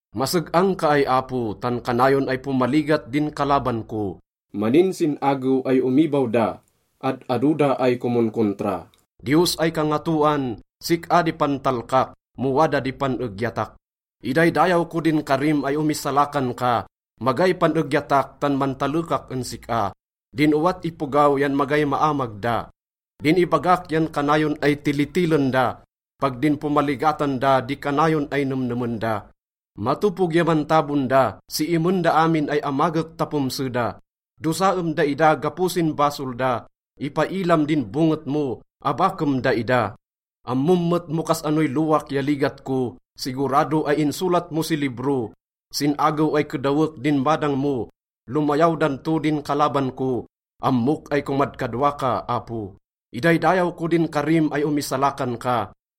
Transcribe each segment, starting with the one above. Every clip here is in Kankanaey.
Maseg-ang ka ay Apo, tan kanayon ay pomaligat din kalaban ko. Maninsin-agew ay omibaw da, ad-ado da ay komonkontra. Diyos ay Kangatoan, sik-a di pantalkak mo wada di pan-egyatak. Idaydayaw ko din karim ay omisalakan ka. Magay pan-egyatak tan mantalekak en sik-a, din owat ipogaw yan magay maamag da. Din ibagak yan kanayon ay tilitilen da. Pag din pomaligatan da di kanayon ay nemnemen da. Matopog ya mantabon da, siimen da amin ay amagek ta pomse da. Dosaem daida gapo sin basol da, ipailam din bonget mo, abakem daida. Ammom met mo kas-anoy lowak ya ligat ko, sigurado ay insolat mo si libro. Sin agew ay kedawek din badang mo, lomayaw dan to din kalaban ko. Ammok ay komadkadwa ka, Apo. Idaydayaw ko din karim ay omisalakan ka.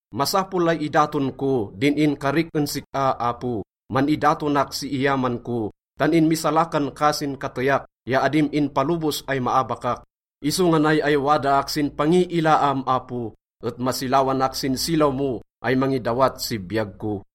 Masapol ay idaton ko din inkarik en sik-a, Apo, man-idatonak si iyaman ko, tan inmisalakan ka sin kateyak ya adim inpalobos ay maabakak. Isonga nay ay wadaak sin pangiilaam, Apo, et masilawanak sin silaw mo ay mangidawat si biyag ko.